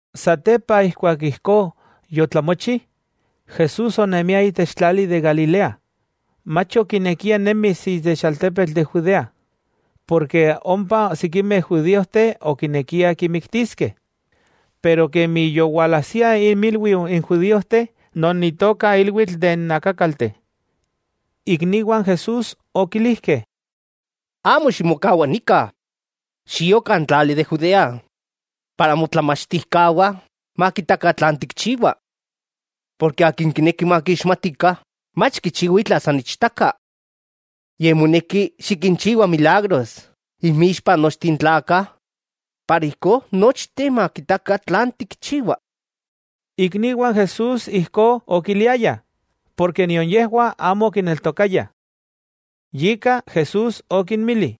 Satepa ijkuak ijkó yotlamochi, Jesús onemia itech tlali de Galilea, mach okinekia nemis itech altepetl de Judea, porke ompa sikimeh judíojteh okinekiah kimiktiskeh. Pero kemi yowalajsia inmilwiu n judíojteh non itoka ilwitl de n akákalteh, ikniwah n Jesús okilijkeh: —Amo ximokawa nika, xio kan tlali de Judea, ijkó motlamachtijkawah, kitaskeh tlan tikchiwa. Porke akin kineki makixmatikah, mach kichiwa itla san ichtaka. Yej moneki xikinchiwa milagros inmixpa nochteh n tlakah para ijkó nochteh makitakah tlan tikchiwa. Ikniwah n Jesús ijkó okiliayah, porke nion yejwah amo okineltokayah. Yika Jesús okinmili: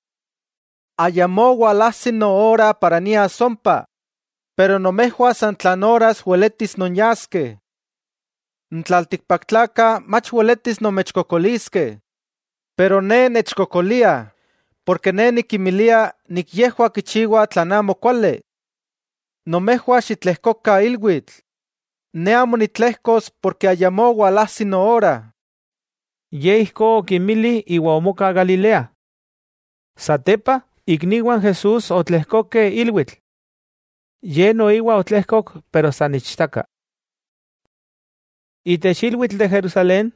—Ayamó walajsi noora para nias ompa, pero nomejwah san tlan oras weletis nonyaskeh. N tlaltikpaktlakah mach weletis nomechkokoliskeh, pero Ne nechkokoliah, porke Ne nikinmilia yejwah kichiwah tlan amo kuali. Nomejwah xitlejkokah ilwitl. Ne amo nitlejkos porke ayamó walajsi noora. Ye ijkó okinmili iwa omoka Galilea. Satepa, ikniwah n Jesús otlejkokeh ilwitl. Ye noiwa otlejkok pero san ichtaka. Itech ilwitl de Jerusalén,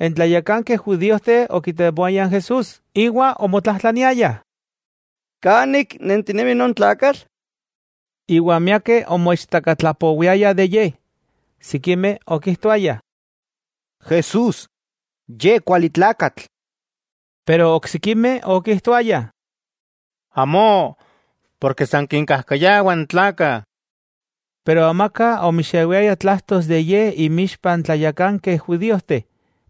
n tlayakankeh judíojteh okitemoayah n Jesús iwa omotlajtlaniayah: —¿Kan ik nentinemi non tlakatl? Iwa miakeh omoichtakatlapowiayah de Ye. Sikimeh okijtoayah: “Jesús, ye kuali tlakatl.” Pero oksikimeh okijtoayah: “Amó, porke san kinkajkayawa n tlakah.” Pero amaka omixewiaya tlajtos de Ye inmiixpa n tlayakankeh judíojteh,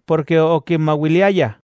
porke okinmawiliayah.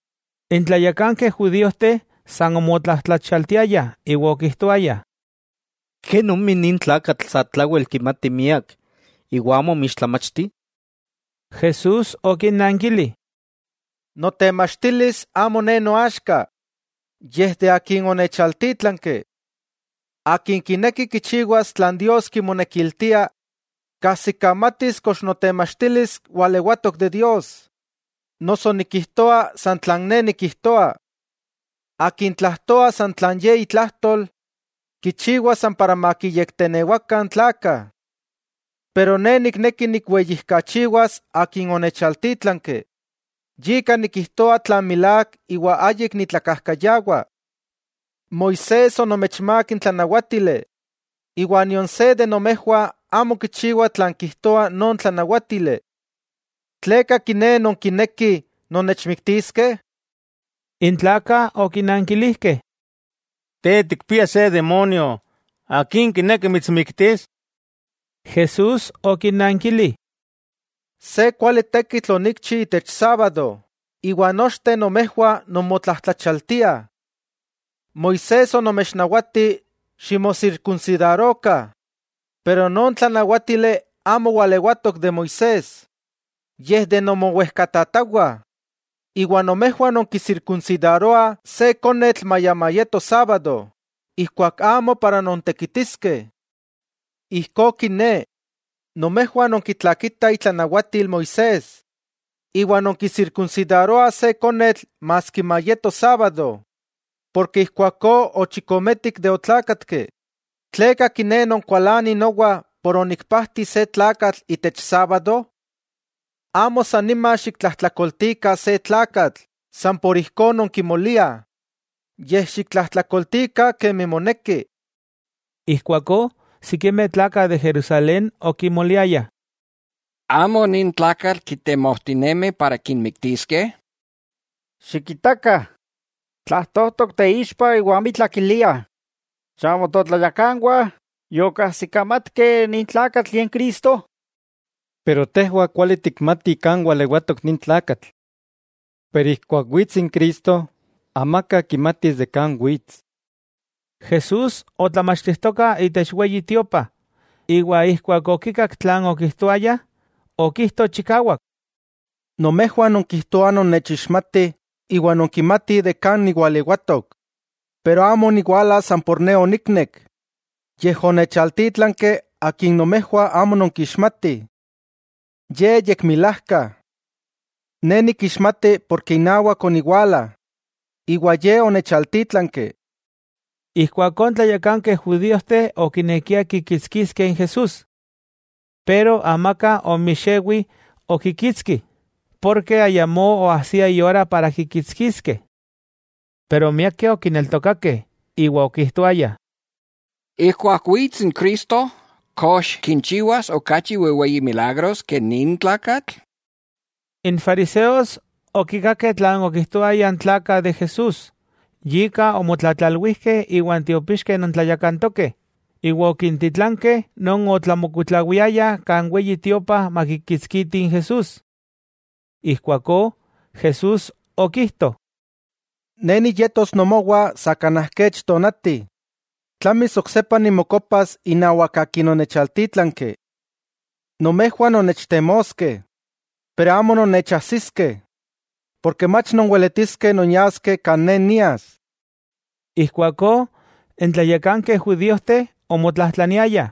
N tlayakankeh judíojteh san omotlajtlachialtiayah iwa okijtoayah: —¿Kenomi nin tlakatl satlawel kimati miak, iwa amo omixtlamachti? Jesús okinnankili: —Notemachtilis amo Ne noaxka, yej de Akin onechaltítlanki. Akin kineki kichiwas tlan Dios kimonekiltia, kajsikamatis kox notemachtilis walewatok de Dios, noso nikijtoa san tlan Ne nikijtoa. Akin tlajtoa san tlan ye itlajtol, kichiwa san para makiyektenewakah n tlakah. Pero Ne nikneki nikweyijkachiwas Akin onechaltítlanki, yika nikijtoa tlan milák iwa ayik nitlakajkayawa. 'Moisés onomechmák n tlanawátili, iwa nion se de nomejwah amo kichiwa tlan kijtoa non tlanawátili. ¿Tleka kiné nonkinekih nonnechmiktiskeh? N tlakah okinankilijkeh: —Te tikpia se demonio; ¿akin kineki mitsmiktis? Jesús okinnankili: —Se kuali tekitl onikchi itech sábado iwa nochteh nomejwah nonmotlajtlachaltiah. Moisés onomechnawati ximosirkunsidarokah, pero non tlanawátili amo walewatok de Moisés, yej de nomowejkatatawah, iwa nomejwah nonkisirkunsidaroah se konetl maya mayeto sábado ijkuak amo para nontekitiskeh. Ijkó kiné, nomejwah nonkitlakitah itlanawatil Moisés, iwa nonkisirkunsidaroah se konetl maski mayeto sábado, porke ijkuakó ochikometik de otlákatki, ¿tleka kiné nonkualanih nowa por onikpajti se tlakatl itech sábado? Amo san nima xiktlajtlakoltikah se tlakatl san por ijkó nonkimoliah, yej xiktlajtlakoltikah kemi moneki. Ijkuakó sikimeh tlakah de Jerusalén okimoliayah: —¿Amo nin tlakatl kitemojtinemih para kimiktiskeh? ¡Xikitakah!, tlajtojtok teixpa iwa amitla kiliah ¿chamo totlayakanwah yokajsikamatkeh nin tlakatl Ye n Cristo? Pero tejwah kuali tikmatih kan walewatok nin tlakatl. Pero ijkuak wits n Cristo, amaka kimatis de kan wits. Jesús otlamachtijtoka itech Weyi Tiopa, iwa ijkuak okikak tlan okijtoayah, okijto chikawak: —¡Nomejwah nonkijtoah nonnechixmatih iwa nonkimatih de kan niwalewatok! Pero amo oniwala san por Ne oniknek, yej onechaltítlanki Akin nomejwah amo nonkixmatih. Ye yekmilajka. Ne nikixmati porke inawak oniwala, iwa Ye onechaltítlanki. Ijkuakó n tlayakankeh judíojteh okinekiah kikitskiskeh n Jesús. Pero amaka omixewi okikitski, porke ayamó oajsia iora para kikitskiskeh. Pero miakeh okineltokakeh, iwa okijtoayah: —Ijkuak wits n Cristo, ¿kox kinchiwas okachi wejweyi milagros ke nin tlakatl? N fariseos okikakeh tlan okijtoayah n tlakah de Jesús, yika omotlatlalwijkeh iwa n tiopixkeh non tlayakantokeh, iwa okintitlankeh non otlamokuitlawiayah kan Weyi Tiopa makikitskitih n Jesús. Ijkuakó Jesús okijto: —Ne niyetos nomowah sa kanaj kech tonati, tlamis oksepa nimokopas inawak Akin onechaltítlanki. Nomejwah nonnechtemoskeh, pero amo nonnechajsiskeh, porke mach nonweletiskeh nonyaskeh kan Ne nias. Ijkuakó n tlayakankeh judíojteh omotlajtlaniayah: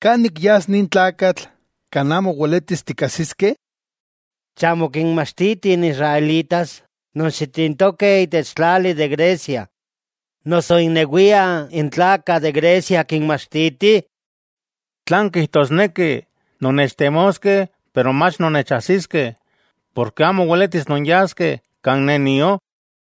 —¿Kan ik yas nin tlakatl, kan amo weletis tikajsiskeh? ¿Chamo kinmachtitih n israelitas non xitintokeh itech tlali de Grecia, noso innewiah n tlakah de Grecia kinmachtiti? ¿Tlan kijtosneki: “Nonnechtemoskeh pero mach nonnechajsiskeh, porke amo weletis nonyaskeh kan Ne nio”?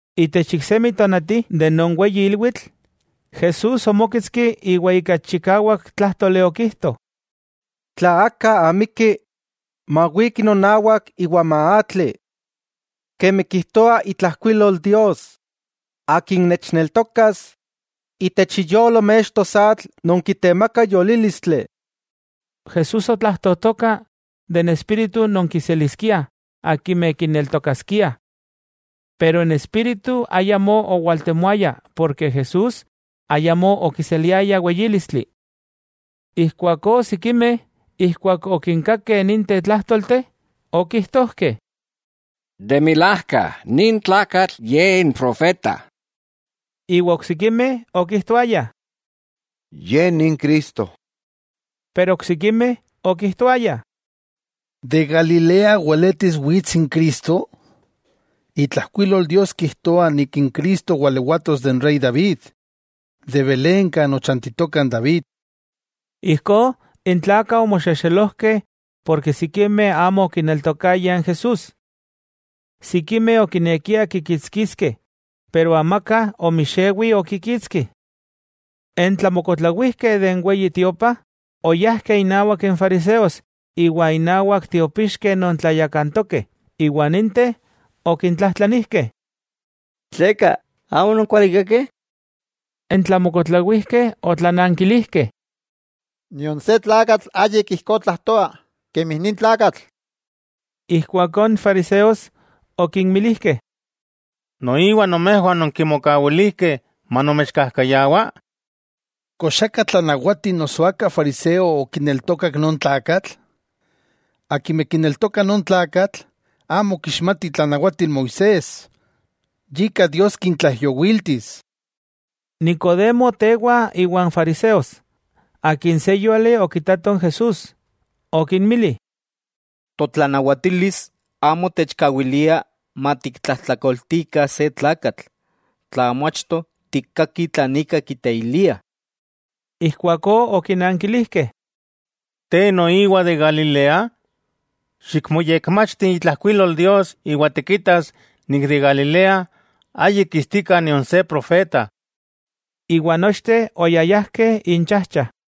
Itech iksemi tonati, de non weyi ilwitl, Jesús omóketski iwa ika chikawak tlájtoli okijto: —Tla aka amiki, mawiki nonawak iwa maatli. Kemi kijtoa itlajkuilol Dios, akin nechneltokas, itech iyolo mextos atl non kitemaka yolílistli. Jesús otlajtojtoka de n Espíritu non kiseliskiah akimeh kineltokaskiah. Pero n Espíritu ayamó owaltemoaya porke Jesús ayamó okiseliaya weyílistli. Ijkuakó sikimeh ijkuak okinkakeh ninteh tlájtolteh, okijtojkeh: —De milajka, nin tlakatl Ye n profeta. Iwa oksikimeh okijtoayah: —Ye ni n Cristo. Pero oksikimeh okijtoayah: —¿De Galilea weletis wits n Cristo? Itlajkuilol Dios kijtoa Cristo walewatos de n Rey David, de Belén kan ochantitoka n David. Ijkó, n tlakah omoxexelojkeh porke sikimeh amo okineltokayah n Jesús. Sikimeh okinekiah kikitskiskeh, pero amaka omixewi okikitski. N tlamokuitlawijkeh de n Weyi Tiopa, oyajkeh innawak n fariseos iwa innawak tiopixkeh non tlayakantokeh, iwa ninteh okintlajtlanijkeh: —¿Tleka amo ononkualikakeh? N tlamokuitlawijkeh otlanankilijkeh: —¡Nion se tlakatl ayik ijkó tlajtoa kemi nin tlakatl! Ijkuakó n fariseos okinmilijkeh: —¿Noiwa nomejwah ononkimokawilijkeh manomechkajkayawa? ¿Kox aka totlanawati noso aka fariseo okineltokak non tlakatl? Akimeh kineltokah non tlakatl, amo kixmati itlanawatil Moisés, yika Dios kintlaijyowíltis. Nicodemo tewa iwan fariseos, akin se yúali okitato n Jesús, okinmili: —Totlanawatilis amo techkawilia matiktlajtlakoltikah se tlakatl, tla amo achto tikkakih tlan ika kiteiliah. Ijkuakó okinankilijkeh: —¿Te noiwa de Galilea? Xikmoyekmachti itlajkuilol Dios iwa tikitas itech Galilea ayik kistika nion se profeta. Iwa nochteh oyayajkeh inchajcha.